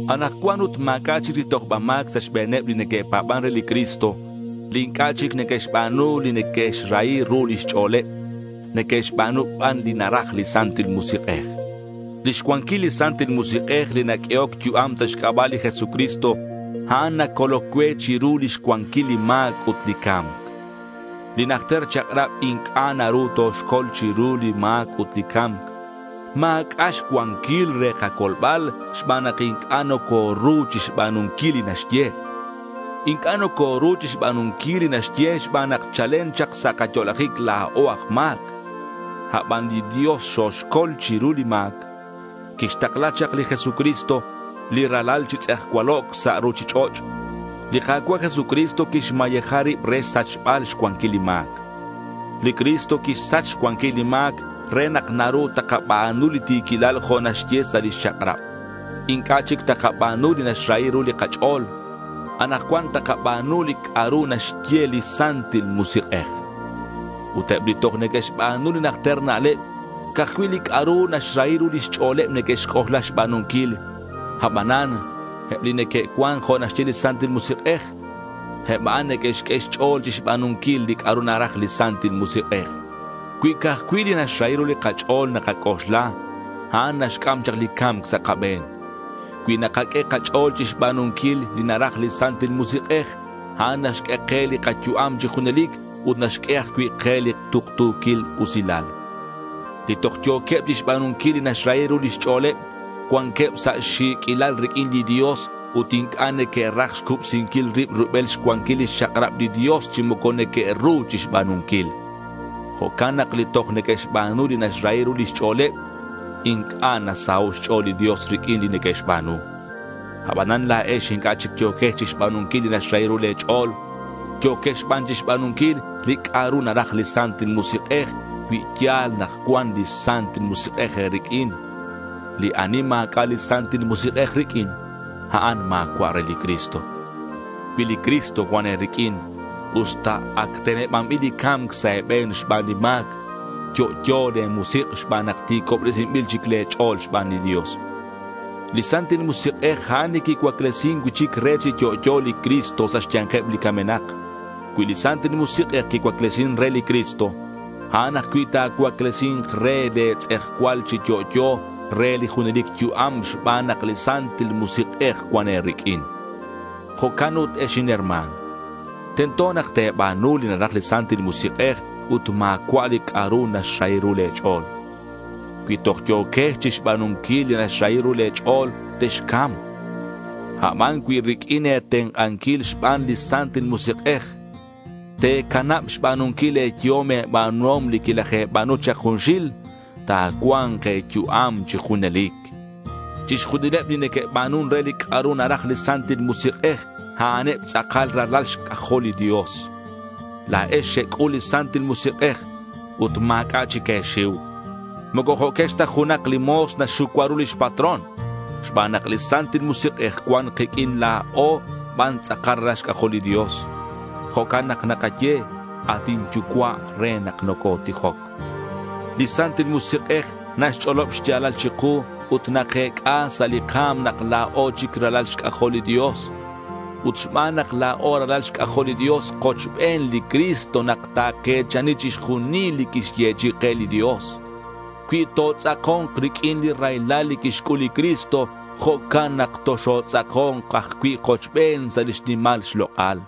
Anakcuan ut ma̱c'a' chic li tojba ma̱c sa' xbe̱neb li neque'pa̱ban re li Cristo, li inc'a' chic neque'xba̱nu li neque'xrahi ru lix ch'o̱leb. Neque'xba̱nu ban li naraj li Santil Musik'ej. Lix cuanquil li Santil Musik'ej li naq'uehoc yu'am sa' xc'aba' li Jesucristo, a'an nacoloc cue chiru lix cuanquil li ma̱c ut li ca̱mc. Li najter chak'rab inc'a' naru toxcol chiru li ma̱c ut li ca̱mc. Ma̱c'a' xcuanquil re kacolbal xban nak inc'a' nocoru chixba̱nunquil li naxye. Inc'a' nocoru chixba̱nunquil li naxye xban nak chalen chak sa' kayo'lajic la̱o aj ma̱c. Aban li Dios xoxcol chiru li ma̱c. Quixtakla chak li Jesucristo li Ralal chi tz'ejcualoc' sa' ruchich'och'. Li Ka̱cua' Jesucristo quixmayeja rib re xsachbal xcuanquil li ma̱c. Li Cristo quixsach xcuanquil li ma̱c re nak naru takaba̱nu li ti̱quilal jo' naxye sa' li chak'rab. Inc'a' chic takaba̱nu li naxrahi ru li kach'o̱l. Anakcuan takaba̱nu li c'a'ru naxye li Santil Musik'ej. Ut eb li toj neque'xba̱nu li najter na'leb, ca'aj cui' li c'a'ru naxrahi ru lix ch'o̱leb neque'xc'oxla xba̱nunquil. Abanan eb li neque'cuan jo' naxye li Santil Musik'ej, eb a'an neque'xq'ue xch'o̱l chixba̱nunquil li c'a'ru naraj li Santil Musik'ej. Cui ca'aj cui' li naxrahi ru li kach'o̱l nakac'oxla, a'an naxc'am chak li ca̱mc sa' kabe̱n. Cui nakaq'ue kach'o̱l chixba̱nunquil li naraj li Santil Musik'ej, a'an naxq'ue ke li kayu'am chi junelic ut naxq'ue ajcui' ke li tuktu̱quil usilal. Li toj yo̱queb chixba̱nunquil li naxrahi ru lix ch'o̱leb, cuanqueb sa' xi̱q'uilal riq'uin li Dios ut inc'a' neque'raj xcubsinquil rib rubel xcuanquil lix chak'rab li Dios chi moco neque'ru chixba̱nunquil. Jo'can nak li toj neque'xba̱nu li naxrahi ru lix ch'o̱leb, inc'a' nasaho' xch'o̱l li Dios riq'uin li neque'xba̱nu. Abanan la̱ex inc'a' chic yo̱quex chixba̱nunquil li naxrahi ru le̱ ch'o̱l. Yo̱quex ban chixba̱nunquil li c'a'ru naraj li Santil Musik'ej cui ya̱l nak cuan li Santil Musik'ej e̱riq'uin. Li ani ma̱c'a' li Santil Musik'ej riq'uin, a'an ma̱cua' re li Cristo. Cui li Cristo cuan e̱riq'uin, usta ac tenebanbil li ca̱mc sa' e̱be̱n xban li ma̱c, yo'yo le̱ musik' xban nak ti̱cobresinbil chic le̱ ch'o̱l xban li Dios. Li Santil Musik'ej, a'an li quicuaclesin cui'chic re chi yo'yo li Cristo sa' xya̱nkeb li camenak. Cui li Santil Musik'ej quicuaclesin re li Cristo, a'an ajcui' ta̱cuaclesi̱nk re le̱ tz'ejcual chi yo'yo re li junelic yu'am xban nak li Santil Musik'ej cuan e̱riq'uin. Jo'can ut ex inherma̱n, tento nak te̱ba̱nu li naraj li Santil Musik'ej ut ma̱cua' li c'a'ru naxrahi ru le̱ ch'o̱l. Cui toj yo̱quex chixba̱nunquil li naxrahi ru le̱ ch'o̱l, texca̱mk. Aban cui riq'uin e̱tenk'anquil xban li Santil Musik'ej, te̱canab xba̱nunquil le̱ yehom e̱ba̱nuhom li quilaje̱ba̱nu chak junxil, ta̱cua̱nk e̱yu'am chi junelic. Chixjunileb li neque'ba̱nun re li c'a'ru naraj li Santil Musik'ej, a'aneb tz'akal ralal xc'ajol li Dios. La̱ex xec'ul li Santil Musik'ej ut ma̱c'a' chic e̱xiu. Moco jo'quex ta junak li mo̱s naxxucua ru lix patrón. Xban nak li Santil Musik'ej cuan kiq'uin, la̱o ban tz'akal ralal xc'ajol li Dios. Jo'can nak nakaye “at inYucua'” re nak nocotijoc. Li Santil Musik'ej naxch'olob xya̱lal chiku, ut nakec'a sa' li ka̱m nak la̱o chic ralal xc'ajol li Dios. Ut xban nak la̱o ralal xc'ajol li Dios, kochben li Cristo nak take̱chani chixjunil li quixyechi'i ke li Dios. Cui totz'ako̱nk riq'uin li raylal li quixc'ul li Cristo, jo'can nak toxotz'ako̱nk ajcui' kochben sa' lix nimal xlok'al.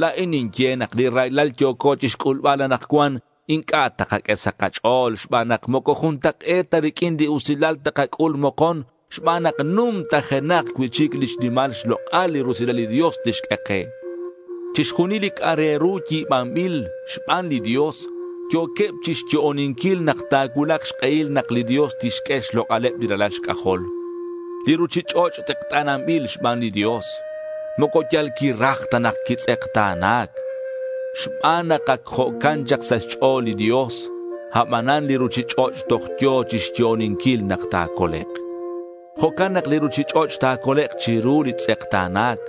La̱in ninye nak li raylal yo̱co chixc'ulbal anakcuan inc'a' takaq'ue sa' kach'o̱l xban nak moco juntak'e̱t ta riq'uin li usilal takac'ul mokon xban nak numtajenak cui'chic lix nimal xlok'al li rusilal li Dios tixq'ue ke. Chixjunil li c'a' re ru yi̱banbil xban li Dios yo̱queb chi xyo'oninquil nak ta̱cuulak xk'ehil nak li Dios tixq'ue xlok'aleb li ralal xc'ajol. Li ruchich'och' tz'ekta̱nanbil xban li Dios. Moco yal quiraj ta nak quitz'ekta̱na̱c. Xban nak ac jo'can chak sa' xch'o̱l li Dios. Abanan li ruchich'och' toj yo̱ chixyo'oninquil nak ta̱colek'. Jo'can nak li ruchich'och' ta̱colek' chiru li tz'ekta̱na̱c.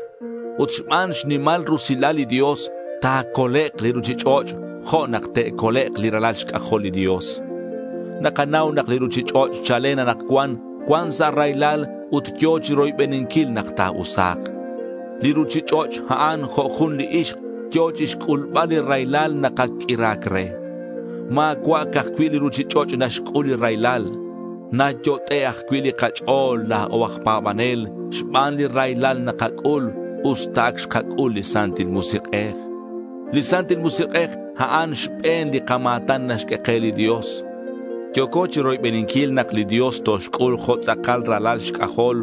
Ut xban xnimal rusilal li Dios, ta̱colek' li ruchich'och', jo' nak te'colek' li ralal xc'ajol li Dios. Nakanau nak li ruchich'och' chalen anakcuan cuan sa' raylal ut yo̱ chiroybeninquil nak ta̱usa̱k. Li ruchich'och', a'an jo' jun li ixk yo̱ chixc'ulbal li raylal nak ac q'uira̱c re. Ma̱cua' ca'aj cui' li ruchich'och' naxc'ul li raylal. Nayot'e' ajcui' li kach'o̱l la̱o aj pa̱banel xban li raylal nakac'ul, usta ac xkac'ul li Santil Musik'ej. Li Santil Musik'ej a'an xbe̱n li kama̱tan naxq'ue ke li Dios. Yo̱co chiroybeninquil nak li Dios toxc'ul jo' tz'akal ralal xc'ajol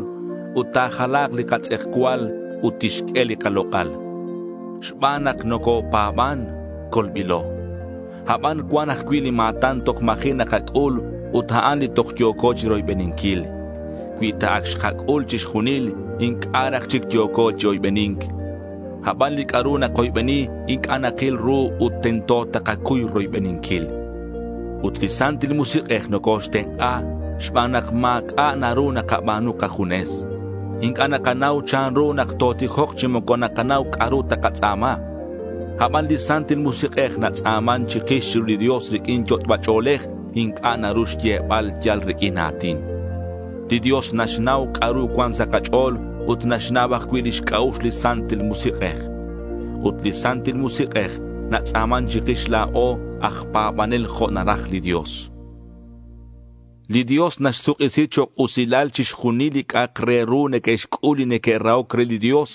ut ta̱jala̱k li katz'ejcual ut tixq'ue li kalok'al. Xban nak nocopa̱ban, colbilo. Aban cuan ajcui' li ma̱tan toj ma̱ji' nakac'ul ut a'an li toj yo̱co chiroybeninquil. Cui ta ac xkac'ul chixjunil, inc'a' raj chic yo̱co chi oybeni̱nc. Aban li c'a'ru nakoybeni inc'a' nakil ru ut tento takacuy roybeninquil. Ut li Santil Musik'ej nocoxtenk'a xban nak ma̱c'a' naru nakaba̱nu kajunes. Inc'a' nakanau chanru nak totijok chi moco nakanau c'a'ru takatz'a̱ma. Aban li Santil Musik'ej natz'a̱man chikix chiru li Dios riq'uin yot'ba ch'o̱lej inc'a' naru xyebal yal riq'uin a̱tin. Li Dios naxnau c'a'ru cuan sa' kach'o̱l ut naxnau ajcui' lix c'a'ux li Santil Musik'ej. Ut li Santil Musik'ej natz'a̱man chikix la̱o aj pa̱banel jo' naraj li Dios. Li Dios naxsuk'isi chok' usilal chixjunil li c'a'ak re ru neque'xc'ul li neque'rahoc re li Dios,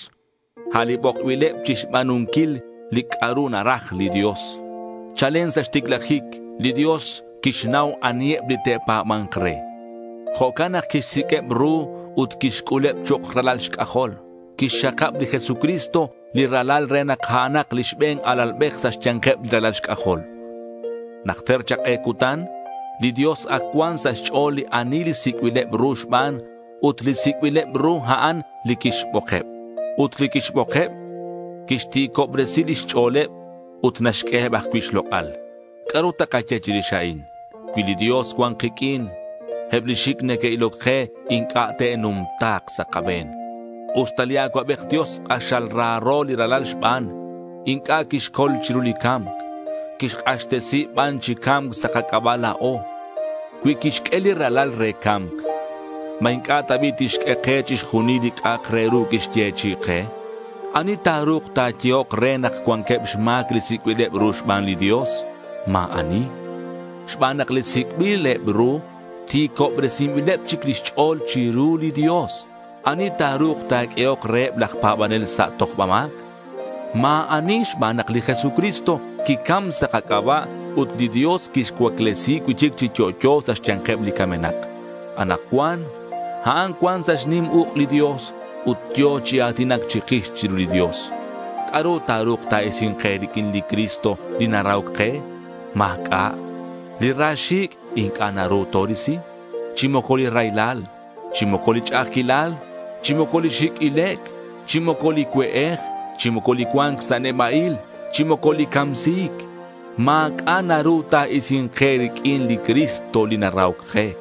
a' li bokbileb chixba̱nunquil li c'a'ru naraj li Dios. Chalen sa' xticlajic li Dios quixnau aniheb li te'pa̱ba̱nk re. Jo'can nak quixsiq'ueb ru ut quixc'uleb chok' ralal xc'ajol. Quixxakab li Jesucristo li Ralal re nak a'anak li xbe̱n alalbej sa' xya̱nkeb li ralal xc'ajol. Najter chak k'e cutan li Dios ac cuan sa' xch'o̱l ani li sic'bileb ru xban, ut li sic'bileb ru a'an li quixbokeb; ut li quixbokeb, quixti̱cobresi lix ch'o̱leb ut naxq'ueheb ajcui' xlok'al. ¿C'a'ru takaye chirix a'in? Cui li Dios cuan kiq'uin, eb li xic' neque'iloc ke inc'a' te'numta̱k sa' kabe̱n. Usta li Acuabej Dios k'axal raro li Ralal xban, inc'a' quixcol chiru li ca̱mc. Quixk'axtesi ban chi ca̱mc sa' kac'aba' la̱o. Cui quixq'ue li Ralal re ca̱mc, ¿ma inc'a' ta bi' tixq'ue ke chixjunil li c'a'ak re ru quixyechi'i ke? ¿Ani ta̱ru̱k ta̱yehok re nak cuanqueb xma̱c li sic'bileb ru xban li Dios? Ma̱ ani, xban nak li sic'bileb ru ti̱cobresinbileb chic lix ch'o̱l chiru li Dios. ¿Ani ta̱ru̱k ta̱q'uehok reheb laj pa̱banel sa' tojba ma̱c? Ma̱ ani xban nak li Jesucristo quicam sa' kac'aba' ut li Dios quixcuaclesi cui'chic chi yo'yo sa' xya̱nkeb li camenak. Anakcuan a'an cuan sa' xnim uk' li Dios ut yo̱ chi a̱tinac chikix chiru li Dios. ¿C'a'ru ta̱ru̱k ta̱isi̱nk ke riq'uin li Cristo li narahoc ke? Ma̱c'a'. Li ra xi̱c' inc'a' naru torisi, chi moco li raylal, chi moco li ch'a'ajquilal, chi moco li xi̱c' ilec', chi moco li cue'ej, chi moco li cua̱nc sa' neba'il, chi moco li camsi̱c. Ma̱c'a' naru ta̱isi̱nk ke riq'uin li Cristo li narahoc ke.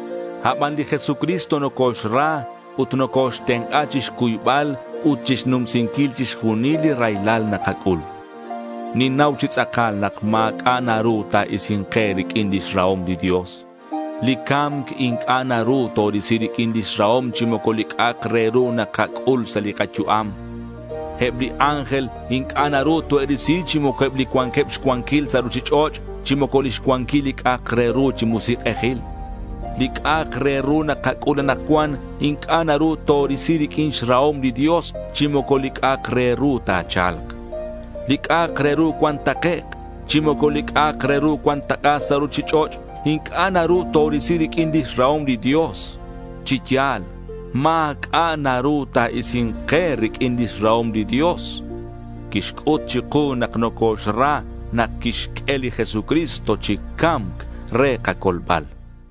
Aban li Jesucristo nocoxra ut nocoxtenk'a chixcuybal ut chixnumsinquil chixjunil li raylal nakac'ul. Ninnau chi tz'akal nak ma̱c'a' naru ta̱isi̱nk ke riq'uin lix rahom li Dios. Li ca̱mc inc'a' naru torisi riq'uin lix rahom chi moco li c'a'ak re ru nakac'ul sa' li kayu'am. Eb li ángel inc'a' naru toe'risi chi moco eb li cuanqueb xcuanquil sa' ruchich'och', chi moco lix cuanquil li c'a'ak re ru chi musik'ejil. Li c'a'ak re ru nakac'ul anakcuan inc'a' naru torisi riq'uin xrahom li Dios chi moco li c'a'ak re ru ta̱cha̱lk. Li c'a'ak re ru cuan takec', chi moco li c'a'ak re ru cuan tak'a sa' ruchich'och' inc'a' naru torisi riq'uin lix rahom li Dios. Chi ya̱l, ma̱c'a' naru ta̱isi̱nk ke riq'uin lix rahom li Dios. Quixc'ut chiku nak nocoxra nak quixq'ue li Jesucristo chi ca̱mc re kacolbal.